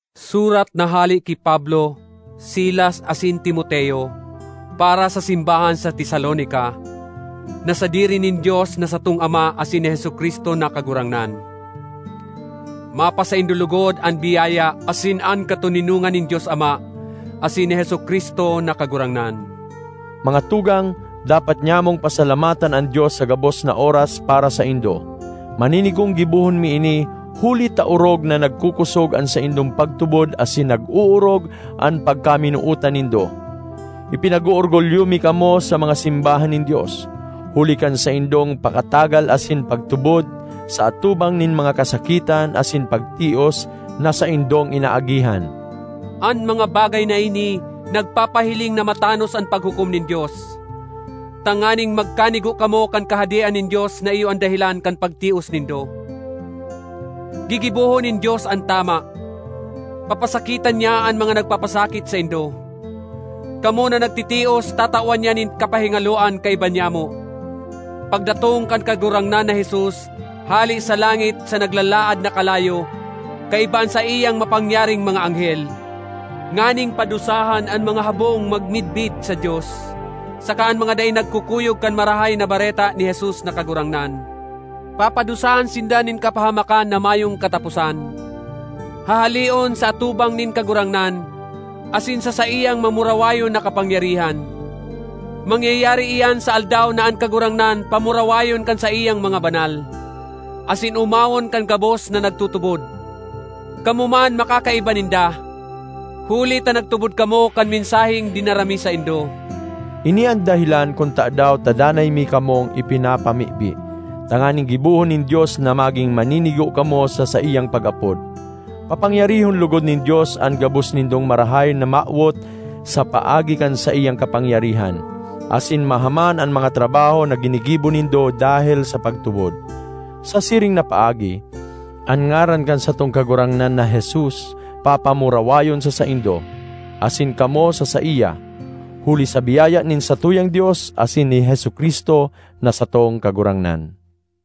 Surat na hale ki Pablo, Silas, asin Timoteo, para sa simbahan sa Tesalonica, na sadiri nin Dios na satong Ama asin ni Jesu-Cristo na Kagurangnan: Mapasaindo logod an biyaya asin an katoninongan nin Dios Ama asin ni Jesu-Cristo na Kagurangnan. Mga tugang, dapat nyamong pasalamatan an Dios sa gabos na oras para saindo. Maninigong gibohon mi ini, huli ta orog na nagkokosog an saindong pagtubod asin nag-oorog an pagkaminootan nindo. Ipinag-oorgulyo mi kamo sa mga simbahan nin Dios, huli kan saindong pakatagal asin pagtubod sa atubang nin mga kasakitan asin pagtios na saindong inaagihan. An mga bagay na ini nagpapahiling na matanos an paghukom nin Dios, tanganing magkanigo kamo kan Kahadean nin Dios na iyo an dahelan kan pagtios nindo. Gigibohon nin Dios an tama; papasakitan niya an mga nagpapasakit saindo. Kamo na nagtitios tatawan niya nin kapahingaloan kaiba nyamo, pagdatong kan Kagurangnan na Jesus hale sa langit sa naglalaad na kalayo kaiba an saiyang mapangyaring mga anghel, nganing padusahan an mga habong magmidbid sa Dios saka an mga dai nagkukuyog kan Marahay na Bareta ni Jesus na Kagurangnan. Papadusahan sinda nin kapahamakan na mayong kataposan, hahaleon sa atubang nin Kagurangnan asin sa saiyang mamurawayon na kapangyarihan. Mangyayari iyan sa Aldaw na an Kagurangnan pamurawayon kan saiyang mga banal, asin omawon kan gabos na nagtutubod. Kamo man makakaiba ninda, huli ta nagtubod kamo kan mensaheng dinara mi saindo. Ini an dahelan kun tadaw ta danay mi kamong ipinapamibi, tanganing gibohon nin Dios na magin maninigo kamo sa saiyang pag-apod. Papangyarihon logod nin Dios an gabos nindong marahay na mawot sa paagi kan saiyang kapangyarihan, asin mahaman an mga trabaho na ginigibo nindo dahel sa pagtubod. Sa siring na paagi, an ngaran kan satong Kagurangnan na Jesus papamurawayon sa saindo, asin kamo sa saiya, huli sa biyaya nin satuyang Dios asin ni Jesu-Cristo na satong Kagurangnan.